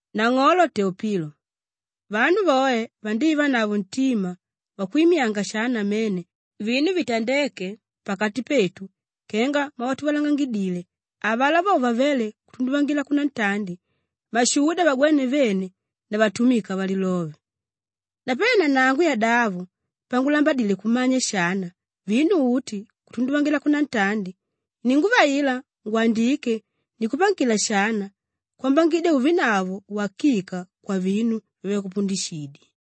Nang'olo Teopilo, vanu voe vandívanavo ntima wakwimyanga shana namene vinu vitandéke pakati petu kenga mwavatuvalangangidile avalá vo vavéle kutunduvangila kunantandi mashuda vagwéne vene na vatumika valilove. Napanelo nanangu yadavo, pangulambadile kumanya shana vinu uti kutunduvangila kunantandi, ininguvaila ngwandike nikupangila shana kwambangidya uvenavo uwakika kwavinu vyavakupundishidye.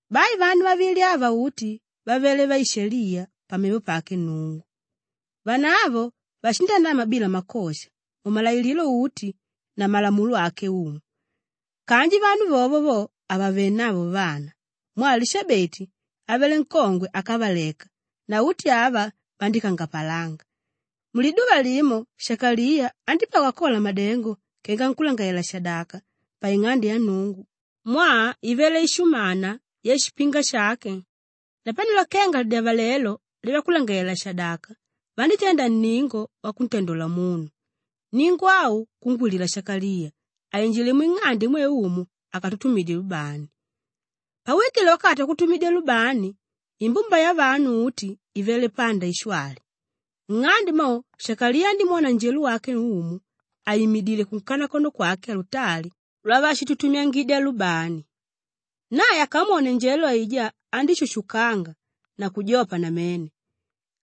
Bai vanu vavili ava uti vavele vaishaliya pamevo pake Nnungu. Vanavo vashindanama bila makosha mumalailililo uti na malamulo ake Umu. Kanji vanu vovo vo havavenavo vana mwaa Lishabeti avele nkongwe ákavaleka na uti ava vandíkangapalanga. Muliduva limo Shakaliya andípagwa akola madengo kenga nkúlangalalela-shadaka paing'ande ya Nnungu mwaa ivele ishumana yashipinga shake. Napanelo kenga lidyavalelo lyavakulangalalela-shadaka vandítenda nningo wakuntandola munu; nningo au kungwilila Shakaliya ainjile mwing'ande imwe Umu akatutumidye lubani. Pauwikile wakati wakututumidya lubani, imbumba yavanu uti ivele panda ishwali. Nng'ande mo Shakaliya andímwona njelo wake Umu àimidile kunkanakono kwake alutali lwavashitutumyangidya lubani. Nae akamwone njelo aijá andíshushukanga na kujopa namene.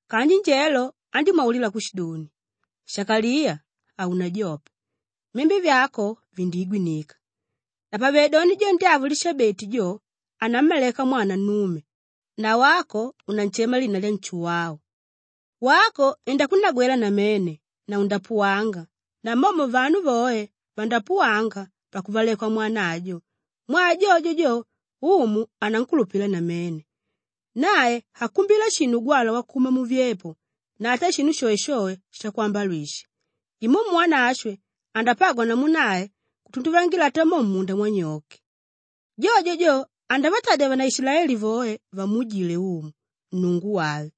Kanji njelo andímwaulila kushidoni, “Shakaliya, haunajope! Myembe vyako vindiigwinika. Napavedoni jo ndyavo Lishabeti jo, anammaleka mwana nnume na wako unanshema lina lya Nshuwau. Wako indakunagwela namene na undapuwanga namomo vanu voe vandapuwanga pakuvalekwa mwana ajo mwaa jojo jo, Umu anankulupila namene. Nae hakumbila shinu ugwalwa wakuma muvyepo na ata shinu shoeshoe shakwambalwisha. Imumu Wanashwe andapagwa namu nae kutunduvangila ata mo mmunda mwanyoke. Jojo jo andavatadya vanaishilaeli voe vamuujile Umu, Nnungu wave.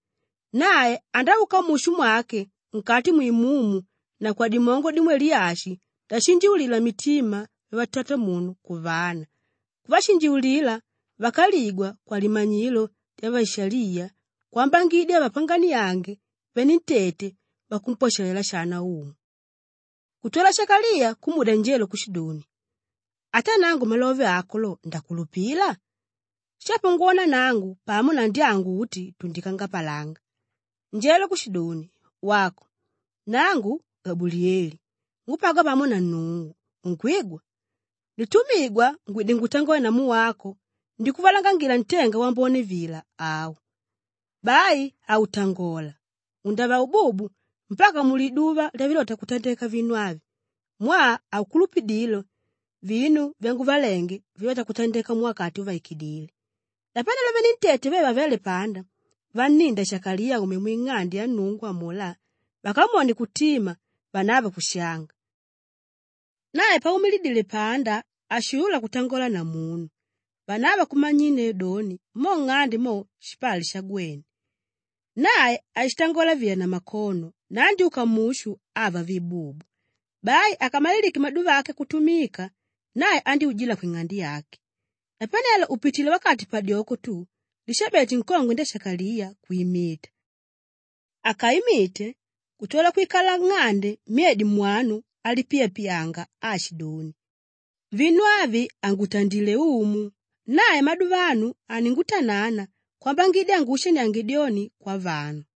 Nae andauka mushu mwake nkati mwimumu na kwadimongo dimwe Liyashi ndashinjiulila mitima vyavatatamunu kuvana, kuvashinjiulila vákaligwa kwalimanyilo lyavaishaliya kwambangidya avapanganiange venentete vakumpwashalela shana Umu.” Kutwala Shakaliya kumudya njelo kushidoni, “Ata nangu malove ako lo ndakulupila? Shapo ngwona nangu pamo na ndyangu uti tundikangapalanga!” Njelo kushidoni, “Wako! Nangu Gabuliyeli ngúpagwa pamo na Nnungu, unkwigwa? Nditumigwa ngwide ngutangole namu wako ndikuvalangangila ntenga wambone vila au. Bai hautangola, undava ububu mpaka muliduva lyavilota kutandeka vinu avi mwaa haukulupidile vinu vyanguvalenge vilóta kutandeka muwakati uvaikidíle.” Napanelo venentete ve vavéle panda vanninda Shakaliya aume mwing'ande ya Nnungu amulá, vakamwone kutima vanavo kushanga. Nae paumidile panda hashuulula kutangola na munu. Vanavo kumanyinneu doni, mo nng'ande mo, shipali shagwene. Nae ashitangola vila na makono na andyúka mushu ava vi bubu. Bai akamalilike maduva ake akutumika, nae andyújila kwing'ande yake. Napanelo upitilé wakati padyoko tu, Lishabeti nkongwe ndya Shakaliya kwimita. Akaimite, kutwala kwikala nng'ande myedi mwanu alipiyapiyanga aashidoni, “Vinu avi angutandilé Umu. Nae maduvano aningutanana kwambangidya anguushaniange dyoni kwavanu.”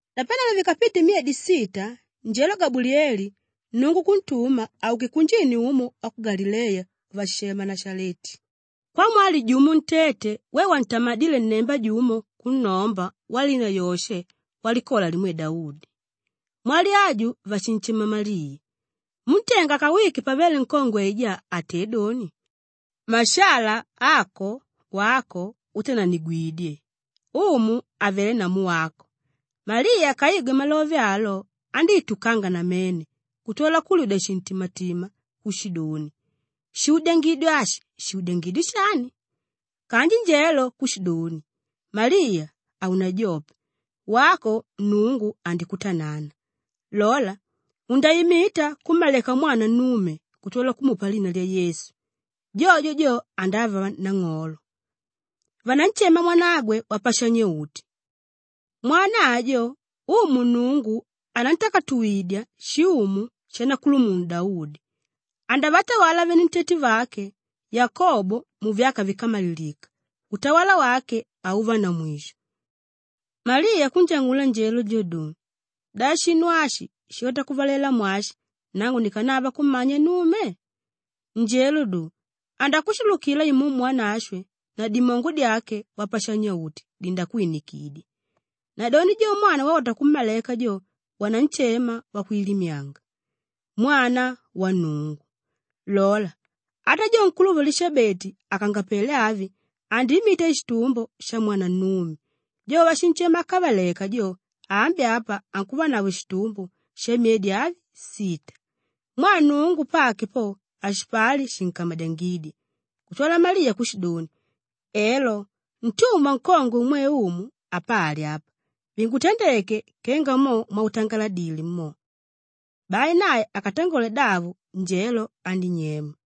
Napanelo vikapite myedi sita, njelo Gabuliyeli Nnungu kuntuma auke kunjini umo wa ku Galileya wavashishema Nashaleti kwamwali jumo ntete we wantamadíle nnemba jumo kunnomba walina Yoshe walikola limwe Daudi. Mwali aju vashinshema Maliya. Múntenga akawike pavele nkongwe aijá atédoni, “Mashala ako wako útananigwidye. Umu avelé namu wako!” Maliya akaigwe malove alo, andíitukanga namene kutwala kulyudya shintimatima kushidoni, “Shuudyangidi ashi shuudyangidi shani?” Kanji njelo kushidoni, “Maliya, haunajope! Wako Nnungu andikutanana. Lola! Undaimita kummaleka mwana nnume kutwala kumupa lina lya Yesu. Jojo jo andava nang'olo. Vananshema mwanagwe Wapashanya-uti. Mwana ajo, Umu Nnungu anantakatuwidya shiumu shanakulumunu Daudi. Andavatawala venentete vake Yakobo muvyaka víkamalilika; utawala wake hauva na mwisho.” Maliya kunjang'ula njelo jo doni, “Da shinu ashi shilota kuvalela mwashi nangu nikanava kummanya nnume?” Njelo do, “Andakushulukila Imumu Wanashwe na dimongo dyake Wapashanya-uti dindakwinikidya. Nadoni jo mwana waulota kummaleka jo, vananshema Wakwilimyanga, Mwana wa Nnungu. Lola! Ata jo nkuluvo Lishabeti àkangapele avi, andiimita shitumbo shamwana nnume. Jo wavashinshema ákavaleka jo, ambi apa ankuvanavo shitumbo shamyedi avi, sita. Mwaa Nnungu pake po, hashipali shinkamadyangídya.” Kutwala Maliya kushidoni, “Elo, ntumwa nkongwe umwe Umu, apali apa; vingutandeke kenga mo mwautangaladile mo.” Bai nae akatangole davo, njelo andínyema.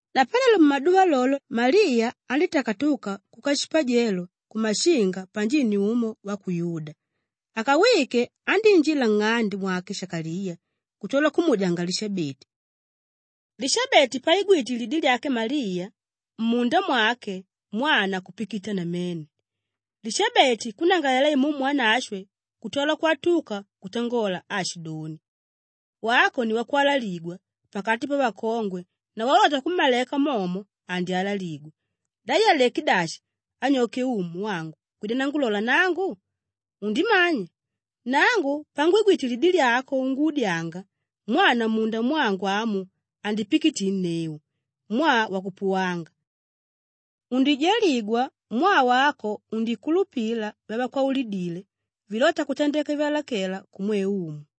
Napanelo mumaduva lolo Maliya andítakatuka kuka shipajelo kumashinga panjini umo wa ku Yuda. Akawike, andíinjila nng'ande mwake Shakaliya kutwala kumuudyanga Lishabeti. Lishabeti paigwite lidi lyake Maliya, mmunda mwake mwana kupikita namene, Lishabeti kunnangalalela Imumu Wanashwe kutwala kwatuka kutangola aashidoni, “Wako ni wakwalaligwa pakati pavakongwe na waulota kummaleka momo, andyalaligwa. Da yaleké dashi anyoke Umu wangu kwida nangulola nangu? Undimanya? Nangu pangwigwite lidi lyako unguudyanga, mwana mmunda mwangu amu andipikitinneu mwaa wakupuwanga. Undijaligwa mwaa wako undikulupila vyavakwaulidile vilóta kutandeka vyalakela kumwe Umu.”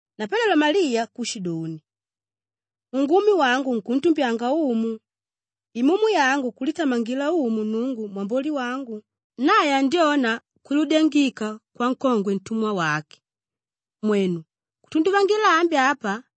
Napanelo Maliya kushidoni, “Ungumi wangu unkuntumbyanga Umu, imumi yangu kulitamangila Umu Nnungu mwamboli wangu. Nae andyona kwiludyangika kwankongwe ntumwa wake. Mwenu! Kutunduvangila ambi apa,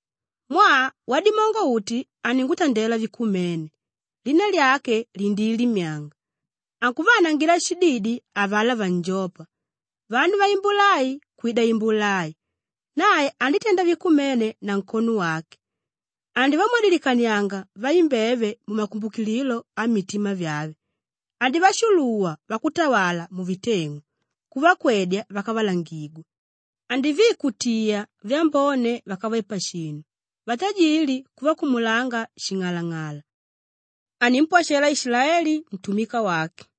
mwaa Wadimongo-Uti aningutandela vikumene; lina lyake lindiilimyanga. Ankuvaanangila shididi avalá vanjópa, vanu vaimbula ai kwida imbula ai. Nae anditenda vikumene na nkono wake; andivamwadilikanianga vaimbeve mumakumbukililo ammitima vyave. Andivashuluwa vakutawala muviteng'u, kuvakwedya vakavalangigwa. Andiviikutiya vyambone vákave pashinu, vatajili kuvakumulanga shing'alang'ala. Animpwashela Ishilaeli ntumika wake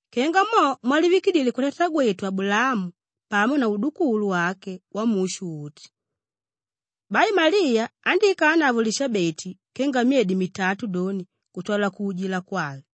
kenga mo mwalivikidile kwatatagwetu Abulaamu pamo na udukulu wake wamushu uti.” Bai Maliya andíikanavo Lishabeti kenga myedi mitatu doni kutwala kuujila kwave.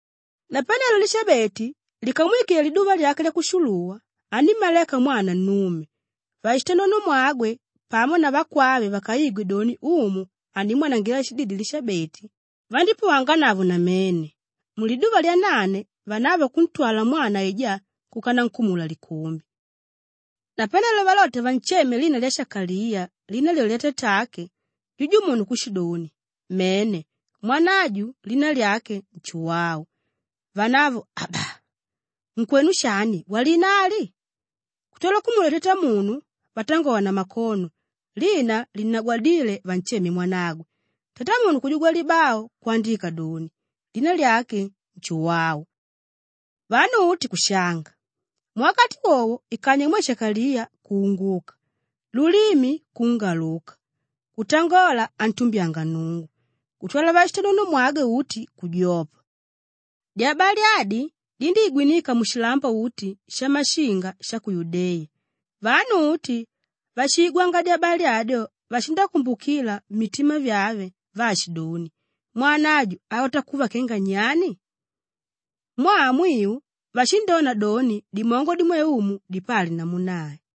Napanelo Lishabeti likamwikile liduva lyake lyakushuluwa, anímmaleka mwana nnume. Vashitanonomwagwe pamo na vakwave vakaigwe doni Umu andimwanangila shididi Lishabeti, vandípuwanganavo namene. Muliduva lyanane vanavo kuntwala mwana aijá kuka nankumula likumbi. Napanelo valota vansheme lina lya Shakaliya lina lyolyo lyatatake, jujumunu kushidoni, “Mene! Mwana aju lina lyake Nshuwau.” Vanavo, “Aba! Nkwenu shani walina ali?” Kutwala kumudya tatamunu vatangola na makono lina linnagwadíle vansheme mwanagwe. Tatamunu kujugwa libau kwandika doni, “Lina lyake Nshuwau.” Vanu uti kushanga. Muwakati wowo ikanywa imwe Shakaliya kuunguka, lulimi kungaluka kutangola antumbyanga Nnungu. Kutwala vashitanonomwagwe uti kujopa. Dyabali adi, dindíigwinika mushilambo uti shamashinga sha ku Yudeya. Vanu uti váshiigwanga dyabali adyo vashindakumbukila mmitima vyave vaashidoni, “Mwana aju alota kuva kenga nyani?” Mwaa mwiu vashindona doni dimongo dimwe Umu dipali namu nae.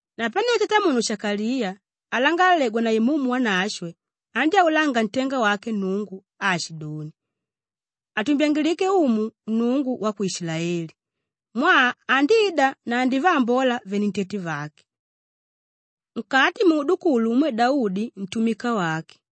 Napanelo tatamunu Shakaliya alangalalegwa na Imumu Wanashwe andyáulanga ntenga wake Nnungu aashidoni, Atumbyangilike Umu Nnungu wa ku Ishilaeli mwaa andida na andivaambola venentete vake. Nkati muudukulu umwe Daudi ntumika wake,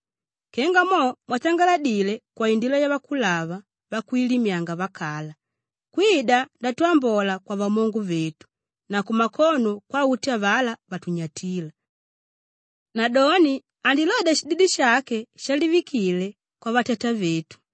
kenga mo mwatangaladile kwaindila yavakulava vakwilimyanga vakala kwida ndatwambola kwavamongo vetu na kumakono kwauti avalá vatunyatíla. Nadoni andilodya shididi shake shalivikile kwavatatavetu,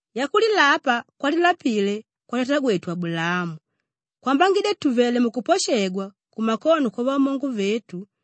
yakulilapa kwalilapile kwatatagwetu Abulaamu kwambangidya tùvele mukuposhegwa kumakono kwavamongo vetu,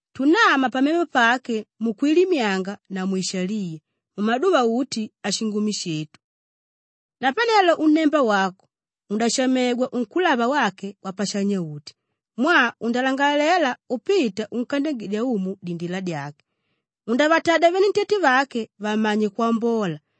tunama pamevo pake mukwilimyanga na mwishaliya mumaduva uti ashingumi shetu. Napanelo unnemba wako undashamegwa unkúlava wake Wapashanya-uti mwaa undalangalela upita unkandyangidya Umu dindila dyake. Undavatadya venentete vake vamanye kwambola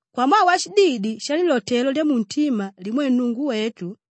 kwamwaa washididi shalilotelo lyamuntima limwe Nnungu wetu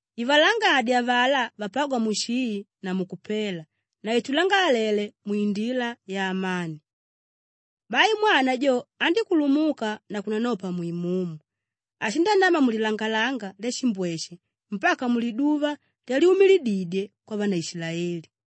ivalangadye avalá vapágwa mushii na mukupela na itulangalalele mwindila yaamani. Bai mwana jo andíkulumuka na kunanopa mwimumu. Ashindanama mulilangalanga lyashimbweshe mpaka muliduva lyalyumilididye kwavanaishilaeli.